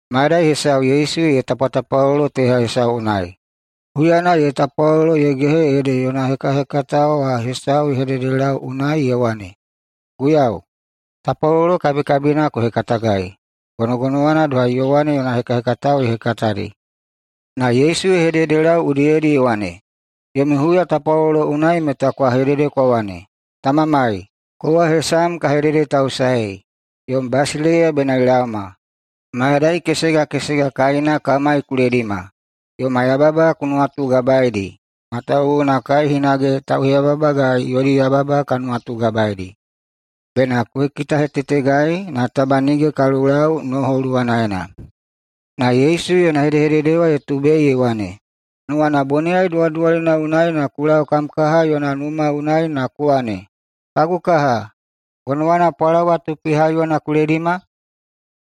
Mayadai hesau Yesu ye tapwatapwalolo teha hesau unai. Huyana ye tapwalolo ye gehe ede yona hekahekatao wa hesau ye hededelau unai ye wane, “Guiyau, tapwalolo kabikabina ku hekatagai, gonogonowana doha Yowane yona hekahekatao ye hekatadi.” Na Yesu ye hededelau udiyedi ye wane, “Yomi huyatapwalolo unai meta kwa hedede kwa wane, Tamamai, Kowa hesam ka hededetausaei. Yom basileiya bena ye laoma. Mayadai kesega kesega kaina kamai ku ledima. Yoma yababa ku nuwatugabaedi matawuwuna kai hinage tauheyababagai yodi yababa ka nuwatugabaedi. Bena ku kitahetetegai na taba nige ka lulau noho luwanaena.” Na Yesu yona hedehedede wa ye tubei ye wane, “Nuwana boniyai duwaduwalina unai na ku lau kam kaha yona numa unai na ku wane, ‘Kagu kaha, gonowana pwalawa tupi haiyona ku haidima?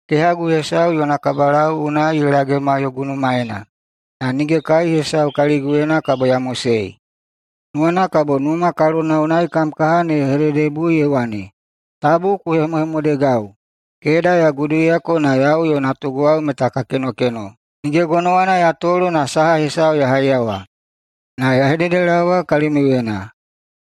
Kehagu hesau yona kabakadau unai ye lagema yogu numaena, na nige kai hesau kaliguyena kabo ya mosei.’ Nuwana kabo numa kalona unai kam kaha ne ye hededebui ye wane, ‘Tabu ku hemohemodegau. Keda ya guduiyako na yau yo natuguwao meta ka kenokeno. Nige gonowana ya tolo na saha hesau ya haiyawa.’ Na ya hededelaowa kalimiuyena: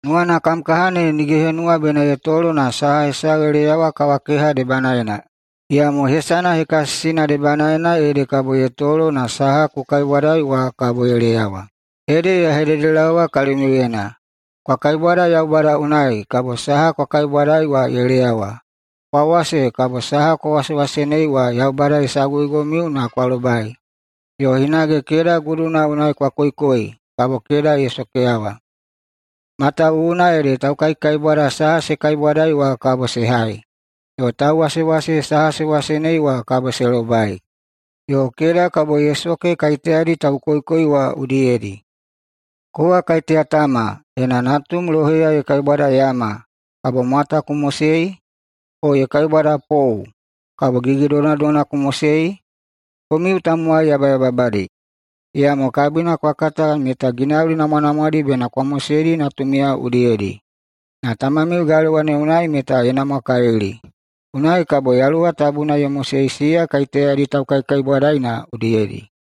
Nuwana kam kaha ne nige ye henuwa bena ye tolo na saha hesau ye leyawa kawakeha debanaena. Iyamo hesana hekasisina debanaena ede kabo ye tolo na saha ku kaibwadai wa kabo ye leyawa. Ede ya hededelaowa kalimiuyena: Kwa kaibwada Yaubada unai, kabo saha kwa kaibwadai wa ye leyawa. Kwa wase, na kabo saha kwa wasewasenei wa Yaubada ye saguigomiu na kwa lobai. Yo hinage keda guduna unai kwa koikoi, kabo keda ye sokeyawa. Matawuwuna ede taukaikaibwada saha se kaibwadai wa kabo se hai, yo tauwasewase saha se wasenei wa kabo se lobai, yo keda kabo ye soke kaiteyadi taukoikoi wa udiyedi. Kowa kaiteya tama, ena natum loheya ye kaibwada yama, kabo mwata ku mosei? O ye kaibwada pou, kabo gigidonadona ku mosei? Komiu tamowai yabayababadi, na iyamo kabina kwa kata meta ginauli namwanamwadi bena kwa moseidi natumiyao udiyedi. Na Tamamiu galewa ne unai meta ye namwakalili, unai kabo Yaluwa Tabuna ye mosei siya kaiteyadi taukaikaibwadaina udiyedi.”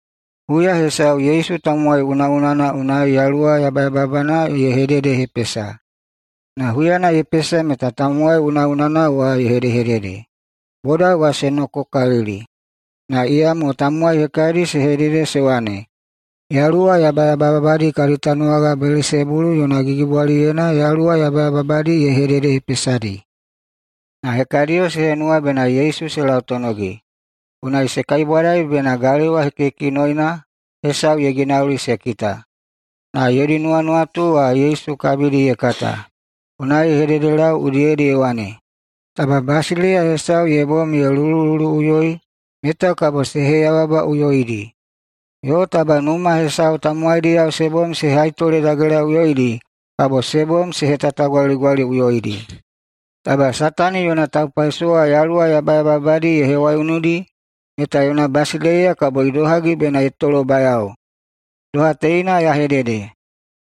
Huya hesau Yesu tamowai unaꞌunana unai yaluwa yabayababana ye hededehepesa, na huyana ye pesa meta tamowai unaꞌunana wa ye hedehedede. Boda wa se nokokalili, na iyamo tamowai hekadi se hedede se wane, “Yaluwa yabayababadi kadi tanuwaga Belesebulu yona gigibwaliyena yaluwa yabayababadi ye hededehepesadi.” Na hekadiyo se henuwa bena Yesu se lautonogi, unai se kaibwadai bena galewa hekihekinoina hesau ye ginauli se kita. Na yodi nuwanuwatu wa Yesu kabidi ye kata. Unai ye hededelau udiyedi ye wane, “Taba basileiya hesau ye bom ye lulululuꞌuyoi, meta kabo se heyababaꞌuyoidi. Yo taba numa hesau tamowaidiyao se bom se haitoledagelaꞌuyoidi, kabo se bom se hetatagwaligwaliꞌuyoidi. Taba Satani yona taupaisowa yaluwa yabayababadi ye hewaiunudi, meta yona basileiya kabo idohagi bena ye tolobayao? Doha teina ya hedede,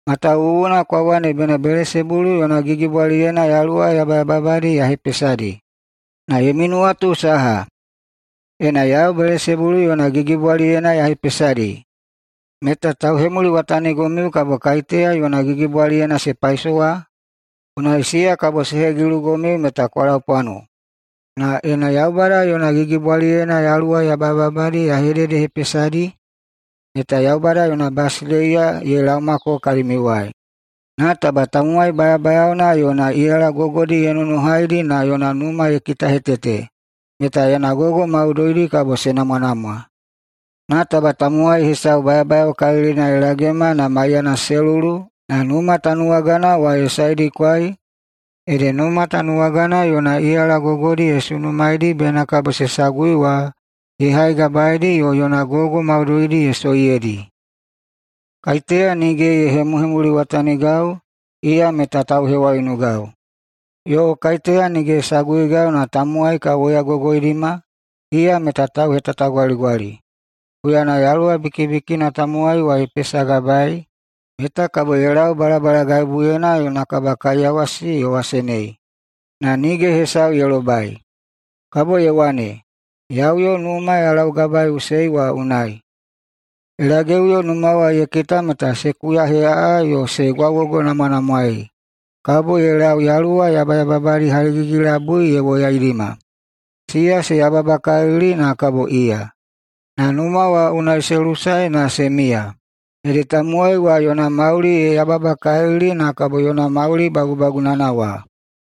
matawuwuna kwa wane bena Belesebulu yona gigibwaliyena yaluwa yabayababadi ya hepesadi. Na yomi nuwatu saha, ena yau Belesebulu yona gigibwaliyena ya hepesadi, meta tauhemuliwatanigomiu kabo kaiteya yona gigibwaliyena se paisowa? Unai siya kabo se hegilugomiu meta kwa laupwano. Na ena Yaubada yona gigibwaliyena yaluwa yabayababadi ya hededehepesadi, meta Yaubada yona basileiya ye laomako kalimiuwai. Na taba tamowai bayabayaona yona iyala gogodi ye nonohaidi na yona numa ye kitahetete, meta yona gogo maudoidi kabo se namwanamwa. Na taba tamowai hesau bayabayaokalilina ye lagema maiyana se lulu na numa tanuwagana wa ye saedikwai, ede numa tanuwagana yona iyala gogodi ye sunumaeidi bena kabo se sagui wa ye haigabaeidi yo yona gogo maudoidi ye soiyeidi. Kaiteya nige ye hemuhemuliwatanigau, iya meta tauhewaiunugau. Yo kaiteya nige ye saguigau na tamowai ka woyagogoidima, iya meta tauhetatagwaligwali. Huyana yaluwa bikibikina tamowai ye pesagabaei, meta kabo ye lau balabalagaibuyena yona kabakaiyawasi ye wasenei, na nige hesau ye lobai. Kabo ye wane, ‘Ya uyo numa ya laugabaeiꞌusei wa unai.’ Ye lageꞌuyo numa wa ye kita meta se kuyaheꞌaꞌa yo se gwaugogonamwanamwaei. Kabo ye lau yaluwa yabayababadi haligigi-labui ye woyaidima. Siya se yababakalili na kabo iya, na numa wa unai se lusae na se miya. Ede tamowai wa yona mauli ye yababakalili na kabo yona mauli bagubagunana wa.”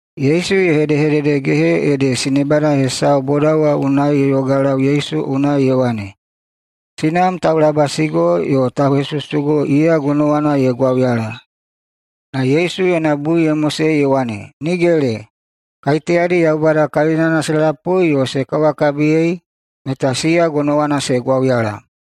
Yesu ye hedehededegehe ede sinebada hesau boda wa unai ye yogalau Yesu unai ye wane, “Sinam taulabasigo yo tauhesusugo, iya gonowana ye gwauyala!” Na Yesu yona bui ye mosei ye wane, “Nigele! Na kaiteyadi Yaubada kalinana se lapui yo se kawakabiyei, meta siya gonowana se gwauyala.”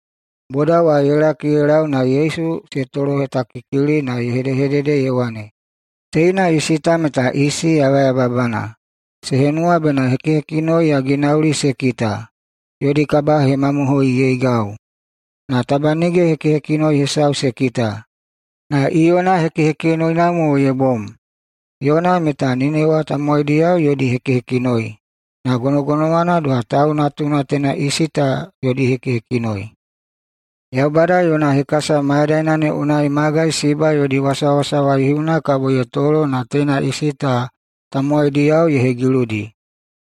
Boda wa ye laki ye lau na Yesu se tolohetakikili na ye hedehedede ye wane, “Teina isi ta meta isi yabayababana. Se henuwa bena hekihekinoi ya ginauli se kita [yodi kabahemamohoiyeigau]. Na taba nige hekihekinoi hesau se kita, na Iyona hekihekinoina mo ye bom. Iyona meta Ninewa tamowaidiyao yodi hekihekinoi, na gonogonowana doha Tau Natuna teina isi ta yodi hekihekinoi. Yaubada yona hekasa mayadaina ne unai magai Siba yodi wasawasa waihiuna kabo ye tolo na teina isi ta tamowaidiyao ye hegiludi,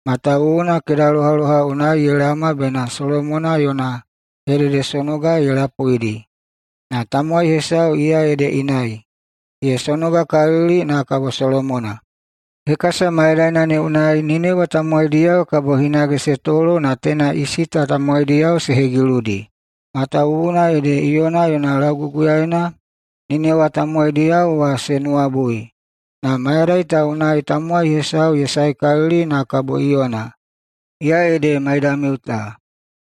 matawuwuna kedalohaloha unai ye laoma bena Solomona yona hededesonoga ye lapuidi. Na tamowai hesau iya ede inai, ye sonogakalili na kabo Solomona. Hekasa mayadaina ne unai Ninewa tamowaidiyao kabo hinage se tolo na teina isi ta tamowaidiyao se hegiludi, matawuwuna ede Iyona yona lauguguyaena Ninewa tamowaidiyao wa se nuwabui. Na mayadai ta unai tamowai hesau ye saekalili na kabo Iyona, iya ede maidamiu ta.”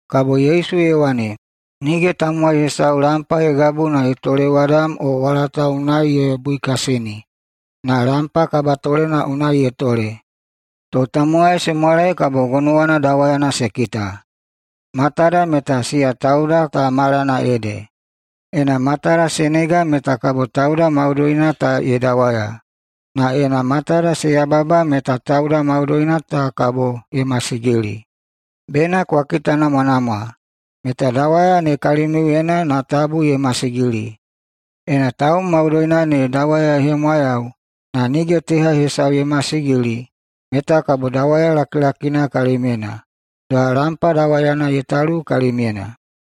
[Kabo Yesu ye wane,] “Nige tamowai hesau lampa ye gabu na ye tolewadam o walata unai ye buikasini, na lampa kabatolena unai ye tole, to tamowai se mwalai kabo gonowana dawayana se kita. Matada meta siya tauda ta malana ede. Ena matada se nega meta kabo tauda maudoina ta ye dawaya. Na ena matada se yababa meta tauda maudoina ta kabo ye masigili. Bena kwa kitanamwanamwa meta dawaya ne kalimiuyena, na tabu masigili. Ena taum maudoina ne dawaya ye hemwayau, na nige teha hesau ye masigili, meta kabo dawaya lakilakina kalimyena, doha lampa dawayana ye talu kalimyena.”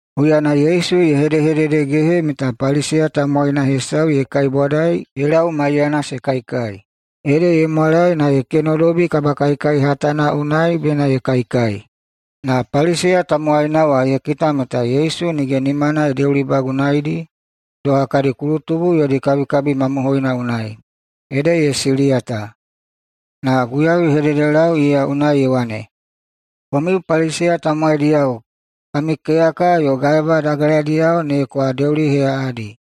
Huyana Yesu ye hedehededegehe meta Paliseya tamowaina hesau ye kaibwadai ye lau maiyana se kaikai. Ede ye mwalae na ye kenodobi kabakaikai hatana unai bena ye kaikai. Na Paliseya tamowaina wa ye kita meta Yesu nige nimana ye deulibagunaeidi doha kadi kulutubu yodi kabikabi mamohoina unai. Ede ye siliyata. Na Guiyau ye hededelau iya unai ye wane, “Komiu Paliseya tamowaidiyao kami keyaka yo gaeba dageladiyao ne kwa deuliheꞌaꞌadi,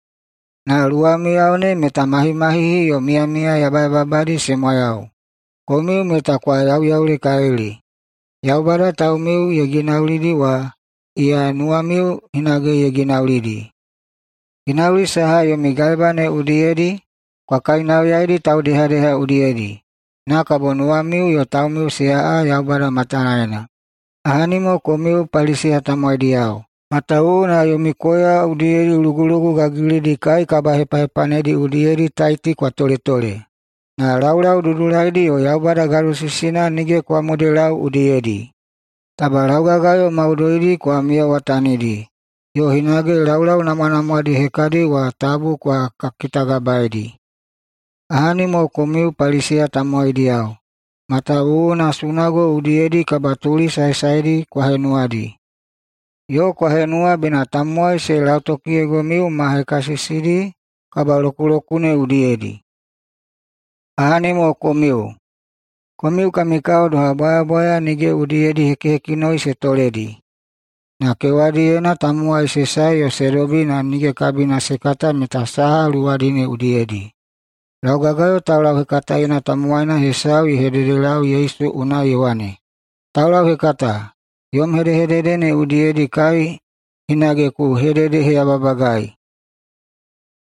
na luwamiyao ne meta mahimahihi yo miyamiya yabayababadi se mwayau! Komiu meta kwa yauyaulekalili! Yaubada taumiu ye ginaulidi wa, iya nuwamiu hinage ye ginaulidi. Ginauli saha yomi gaeba ne udiyedi, kwa kainauyaidi taudehadeha udiyedi, na kabo nuwamiu yo taumiu se aꞌa Yaubada matanaena. Ahani mo komiu Paliseya tamowaidiyao, matawuwuna yomi koya udiyedi lugulugu gagilidi kai kabahepahepanedi udiyedi taiti kwa toletole, na laulau dudulaidi yo Yaubada gadosisina nige kwa modelau udiyedi. Taba laugagayo maudoidi kwa miyawatanidi, yo hinage laulau namwanamwadi hekadi wa tabu kwa kitagabaedi. Ahani mo komiu Paliseya tamowaidiyao. Matawuwuna sunago udiyedi kabatuli saesaedi kwa henuwadi, yo kwa henuwa bena tamowai se lautokiyeigomiu ma hekasisidi kabalokulokune udiyedi. Ahani mo komiu. Komiu kami kao doha bwayabwaya nige udiyedi hekihekinoi se toledi, na kewadiyena tamowai se sae se dobi na nige kabina se kata meta saha luwadi ne udiyedi.” Laugagayo taulauhekataena tamowaina hesau ye hededelau Yesu unai ye wane, “Taulauhekata, yom hedehedede ne udiyedi kai hinage ku hededeheyababagai!”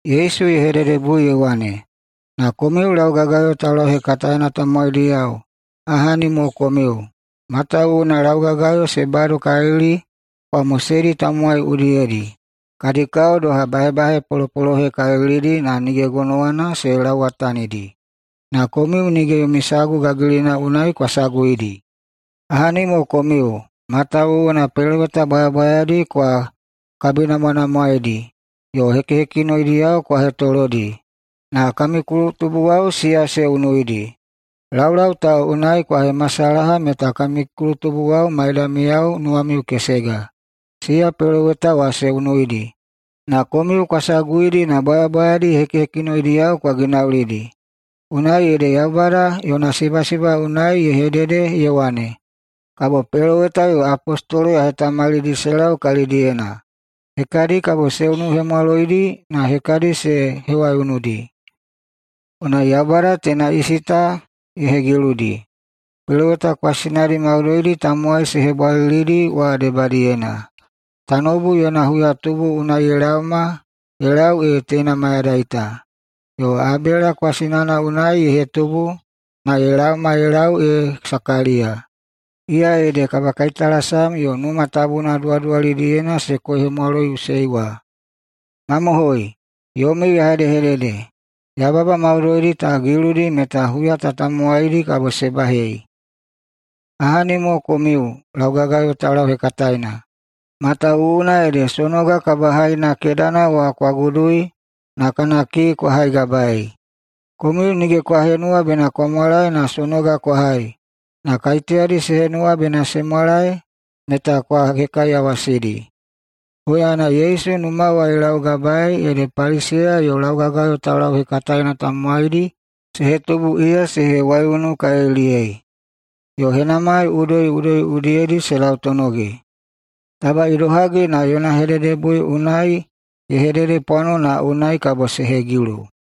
Yesu ye hededebui ye wane, “Na komiu laugagayo taulauhekataena tamowaidiyao, ahani mo komiu. Matawuwuna laugagayo se badokalili kwa moseidi tamowai udiyedi. Kadi kao doha bahebahe polopolohekalilidi, na nige gonowana se lauwatanidi. Na komiu nige yomi sagu gagilina unai kwa saguidi. Ahani mo komiu. Matawuwuna peloweta bwayabwayadi kwa kabinamwanamwaedi yo hekihekinoidiyao kwa hetolodi, na kami kulutubuwao siya se unuidi. Laulau ta unai kwa hemasalaha meta kami kulutubuwao maidamiyao nuwamiu kesega. Siya peloweta wa se unuidi, na komiu kwa saguidi na bwayabwayadi hekihekinoidiyao kwa ginaulidi. Unai ede Yaubada yona sibasiba unai ye hedede ye wane, ‘Kabo peloweta yo apostolo ya hetamalidi se lau kalidiyena. Hekadi kabo se unuhemwaloidi na hekadi se hewaiunudi!’ Unai Yaubada teina isi ta ye hegiludi peloweta kwasinadi maudoidi tamowai se hebwalilidi wa debadiyena, tanoubu yona huyahetubu unai ye laoma ye lau ee teina mayadai ta, yo Abela kwasinana unai ye hetubu na ye laoma ye lau ee Sakaliya, iya ede kabakaitalasam yo Numa Tabuna duwaduwalidiyena se koihemwaloiꞌusei wa. Mamohoi, yomiu ya hedehedede, yababa maudoidi ta giludi meta huya ta tamowaidi kabo se bahei. Ahani mo komiu laugagayo taulauhekataena. Matawuwuna ede sonoga kabahaina kedana wa kwa gudui na kana kii kwa haigabaei. Komiu nige kwa henuwa bena kwa mwalaei na sonoga kwa hai, na kaiteyadi se henuwa bena se mwalae meta kwa hekaiyawasidi.” Huyana Yesu numa wa ye laugabae ede Paliseya yo laugagayo taulauhekataena tamowaidi se hetubu iya se hewaiunukaliliyei, yo henamai udoiꞌudoi udiyedi se lautonogi taba idohagi na yona hededebui unai ye hededepwano na unai kabo se hegilu.